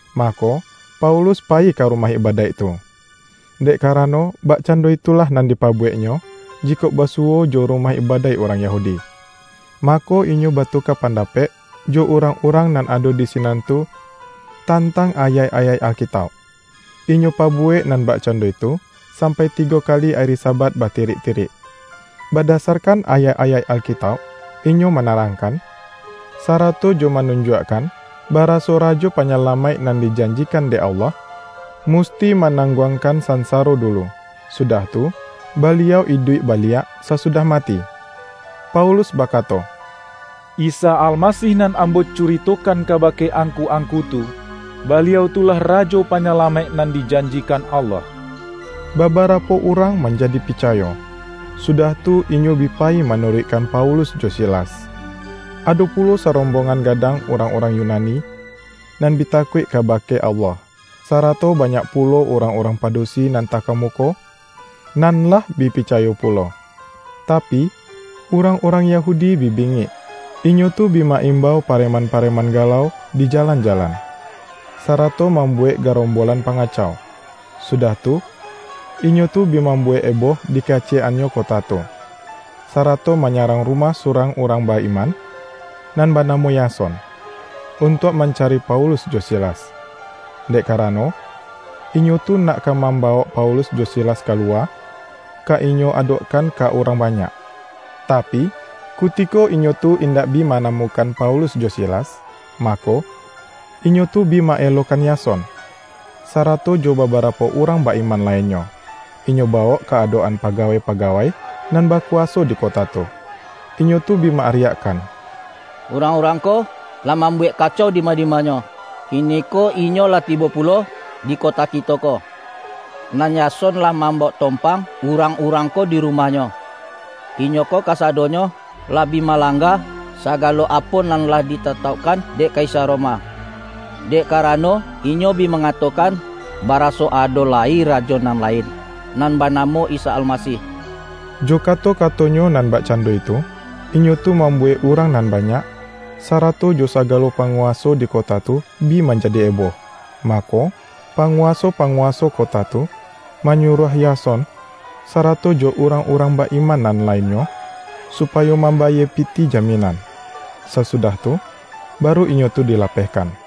Mako, Paulus payi ka rumah ibadaik tu — dek karano, bakcando itulah nan dipabuweknyo, jikok basuwo jo rumah ibadaik urang Yahudi — mako inyo batuka pandapek jo urang-urang nan ado di sinan tu, tantang ayaik-ayaik Alkitauk. Inyo pabuwek nan bakcando itu, sampai tigo kali ari Sabat batirik-tirik. Badasarkan ayaik-ayaik Alkitauk, inyo manarangkan, sarato jo manunjuakkan, baraso Rajo Panyalamaik nan dijanjikan dek Allah, musti manangguangkan sansaro dulu, sudah tu, Baliau iduik baliak sasudah mati. Paulus bakato,”Isa Almasih nan ambo curitokan kabake angku-angku tu, Baliau tu lah Rajo Panyalamaik nan dijanjikan Allah.” Babarapo urang manjadi picayo, sudah tu inyo bi payi manuruikkan Paulus jo Silas; ado pulo sarombongan gadang urang-urang Yunani, nan bi takuik kabake Allah, sarato banyak pulo urang-urang padusi nan takamuko, nan lah bi picayo pulo. Tapi, urang-urang Yahudi bi bingik. Inyo tu bi ma-imbau pareman-pareman galau di jalan-jalan, sarato mambuwek garombolan pangacau. Sudah tu, inyo tu bi mambuwek eboh di kaciyek-annyo kota tu, sarato manyarang rumah surang urang ba-iman, nan banamo Yason, untuak mancari Paulus jo Silas, dek karano inyo tu nak ka mambawok Paulus jo Silas kaluwa, ka inyo adokkan ka urang banyak. Tapi, kutiko inyo tu indak bi manamukan Paulus jo Silas, mako, inyo tu bi ma-elokan Yason, sarato jo babarapo urang ba-iman lainnyo, inyo bawok ka adok-an pagawai-pagawai nan bakuwaso di kota tu. Inyo tu bi ma-ariakkan,”Urang-urang ko lah mambuwek kacau dima-dimanyo! Kiniko inyo lah tibo pulo di kota kito ko, nan Yason lah mambawok tompang urang-urang ko di rumahnyo. Inyo ko kasadonyo, lah bi malangga sagalo apo nan lah ditataukkan dek Kaisar Roma, dek karano inyo bi mangatokan, baraso ado lai Rajo nan lain, nan banamo Isa Almasih.” Jo kato-katonyo nan bakcando itu, inyo tu mambuwek urang nan banyak, sarato jo sagalo panguwaso di kota tu, bi manjadi eboh. Mako panguwaso-panguwaso kota tu, manyuruah Yason, sarato jo urang-urang ba-iman nan lainnyo, supayo mambayie pitih jaminan. Sasudah tu, baru inyo tu dilapehkan.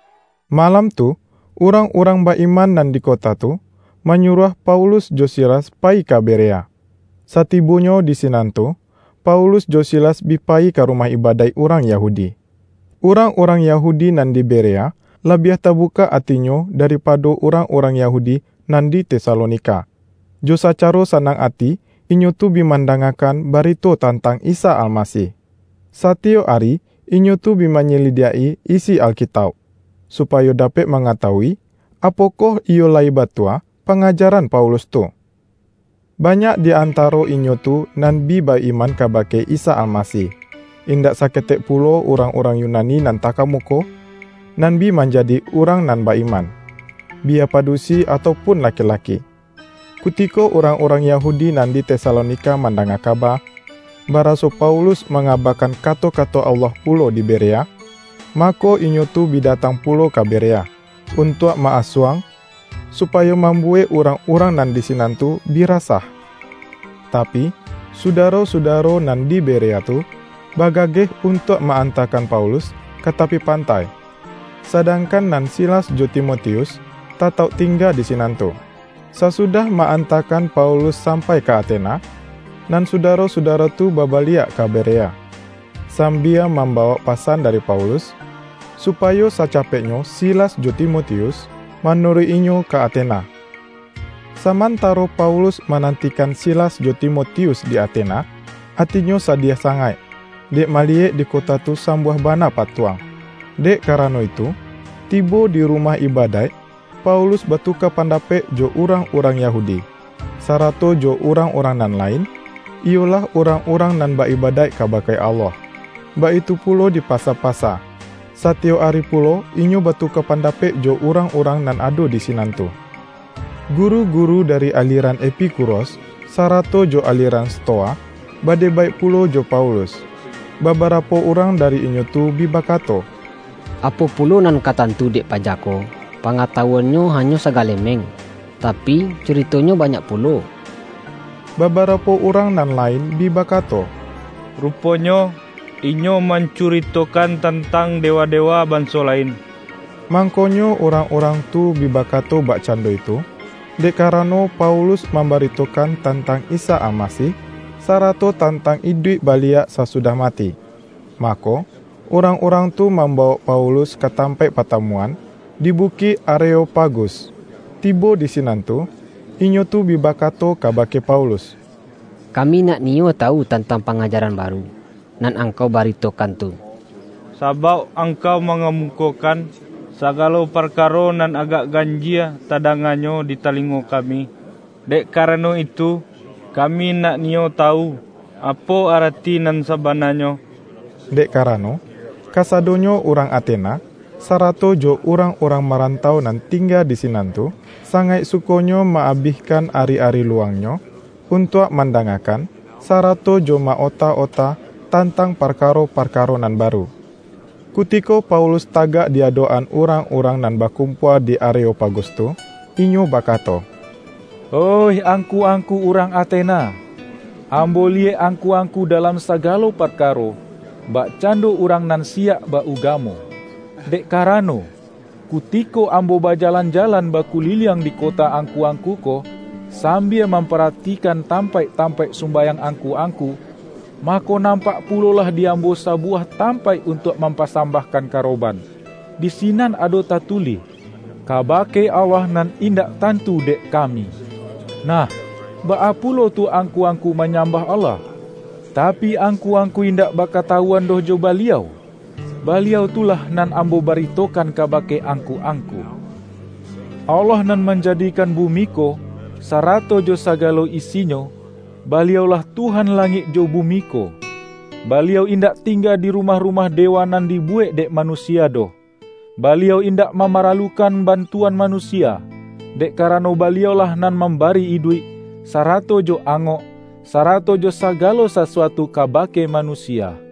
Malam tu, urang-urang ba-iman nan di kota tu, manyuruah Paulus jo Silas payi ka Berea. Satibonyo di sinan tu, Paulus jo Silas bi payi ka rumah ibadaik urang Yahudi. Urang-urang Yahudi nan di Berea, labiah tabukak atinyo daripado urang-urang Yahudi nan di Tesalonika. Jo sacaro sanang ati inyo tu bi mandangakan barito tantang Isa Almasih, satiyok ari inyo tu bi manyalidiak-i isi Alkitauk, supayo dapek mangatawui, apokoh iyo lai batua pangajaran Paulus tu. Banyak di antaro inyo tu nan bi ba-iman kabake Isa Almasih, indak saketek pulo urang-urang Yunani nan takamuko, nan bi manjadi urang nan ba-iman; biya padusi atau pun laki-laki. Kutiko urang-urang Yahudi nan di Tesalonika mandanga kaba, baraso Paulus mangabakan kato-kato Allah pulo di Berea, mako inyo tu bi datang pulo ka Berea, untuak ma-asuang, supayo mambuwek urang-urang nan di sinan tu bi rasah. Tapi, sudaro-sudaro nan di Berea tu bagageh untuak ma-antakan Paulus ka tapi pantai, sadangkan nan Silas jo Timotius tatauk tingga di sinan tu. Sasudah ma-antakan Paulus sampai ka Atena, nan sudaro-sudaro tu babaliak ka Berea, sambia mambawok pasan dari Paulus, supayo sacapeknyo Silas jo Timotius, manuruik-inyo ka Atena. Samantaro Paulus manantikan Silas jo Timotius di Atena, atinyo sadiah sangaik, dek maliyek di kota tu sambuah bana patuang. Dek karano itu, tibo di rumah ibadaik Paulus batuka pandapek jo urang-urang Yahudi, sarato jo urang-urang nan lain, iyolah urang-urang nan ba-ibadaik kabake Allah. Baitu pulo di pasa-pasa, satiyok ari pulo inyo batuka pandapek jo urang-urang nan ado di sinan tu. Guru-guru dari aliran Epikuros, sarato jo aliran Stoa, badebaik pulo jo Paulus. Babarapo urang dari inyo tu bi bakato,”Apo pulo nan ka tantu dek paja ko? Pangatawuannyo hanyo sagalemeng, tapi, curitonyo banyak pulo!” Babarapo urang nan lain bi bakato,”Ruponyo, inyo mancuritokan tantang dewa-dewa banso lain.” Mangkonyo urang-urang tu bi bakato bakcando itu, dek karano Paulus mambaritokan tantang Isa Almasih, sarato tantang iduik baliak sasudah mati. Mako, urang-urang tu mambawok Paulus ka tampaik patamuan, di Bukik Areopagus. Tibo di sinan tu, inyo tu bi bakato kabake Paulus,”Kami nak niyo tawu tantang pangajaran baru, nan angkau baritokan tu. Sabauk angkau mangamukokan, sagalo parkaro nan agak ganjie tadanganyo di talingo kami. Dek karano itu, kami nak niyo tawu, apo arati nan sabananyo.” ( Dek karano, kasadonyo urang Atena, sarato jo urang-urang marantau nan tingga di sinan tu, sangaik sukonyo ma-abihkan ari-ari luwangnyo, untuak mandangakan, sarato jo ma-ota-ota tantang parkaro-parkaro nan baru.) Kutiko Paulus tagak di adok-an urang-urang nan bakumpua di Areopagus tu, inyo bakato,”Oih angku-angku urang Atena! Ambo liyek angku-angku dalam sagalo parkaro, bakcando urang nan siyak ba-ugamo. Dek karano, kutiko ambo bajalan-jalan, bakuliliang di kota angku-angku ko, sambia mamparatikan tampaik-tampaik sumbayang angku-angku, mako nampak pulolah di ambo sabuwah tampaik untuak mampasambahkan karoban; di sinan ado tatulih, ’Kabake Allah Nan Indak Tantu Dek Kami.’ Nah, baa pulo tu angku-angku manyambah Allah, tapi, angku-angku indak bakatawuan doh jo Baliau, Baliau tu lah, nan ambo baritokan kabake angku-angku. Allah nan manjadikan bumi ko, sarato jo sagalo isinyo, Baliau-lah Tuhan langik jo bumi ko. Baliau indak tingga di rumah-rumah dewa nan dibuwek dek manusia doh. Baliau indak mamaralukan bantuan manusia, dek karano Baliau-lah nan mambari iduik, sarato jo angok, sarato jo sagalo sasuatu kabake manusia.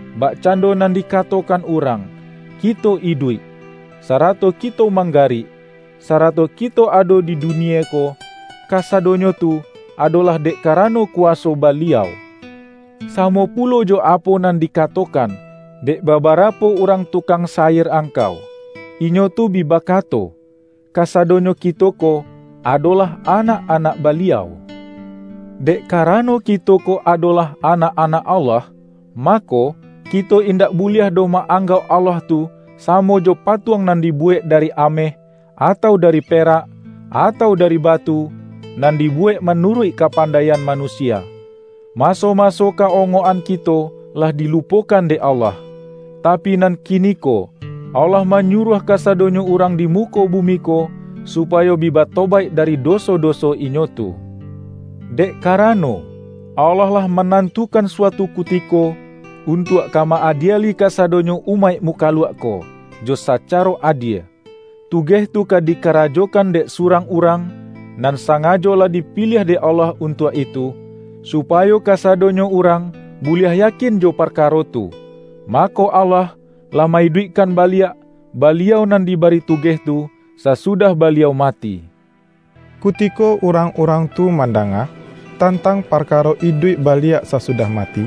Bakcando nan dikatokan urang, ’Kito iduik, sarato kito manggarik, sarato kito ado di dunie ko, kasadonyo tu, adolah dek karano kuwaso Baliau.’ Samo pulo jo apo nan dikatokan, dek babarapo urang tukang syair angkau. Inyo tu bi bakato, ’Kasadonyo kito ko, adolah anak-anak Baliau.’ Dek karano kito ko adolah anak-anak Allah, mako, kito indak buliah doh ma-anggauk Allah tu, samo jo patuang nan dibuwek dari ameh, atau dari perak, atau dari batu, nan dibuwek manuruik kapandaian manusia. Maso-maso ka-ongok-an kito lah dilupokan dek Allah, tapi, nan kiniko Allah manyuruah kasadonyo urang di muko bumi ko, supayo bi batobaik dari doso-doso inyo tu. Dek karano, Allah lah manantukan suatu kutiko, untuak ka ma-adieli kasadonyo umaik mukaluak ko, jo sacaro adie. Tugeh tu ka dikarajokan dek surang Urang, nan sangajo lah dipiliah dek Allah untuak itu. Supayo kasadonyo urang buliah yakin jo parkaro tu, mako Allah, lah ma-iduikkan baliak, Baliau nan dibari tugeh tu, sasudah Baliau mati!” Kutiko urang-urang tu mandanga, tantang parkaro iduik baliak sasudah mati,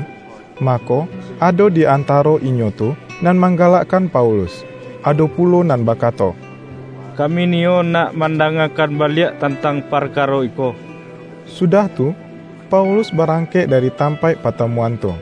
mako, ado di antaro inyo tu nan manggalakkan Paulus. Ado pulo nan bakato,”Kami niyo nak mandangakan baliak tantang parkaro iko.” Sudah tu, Paulus barangkek dari tampaik patamuan tu.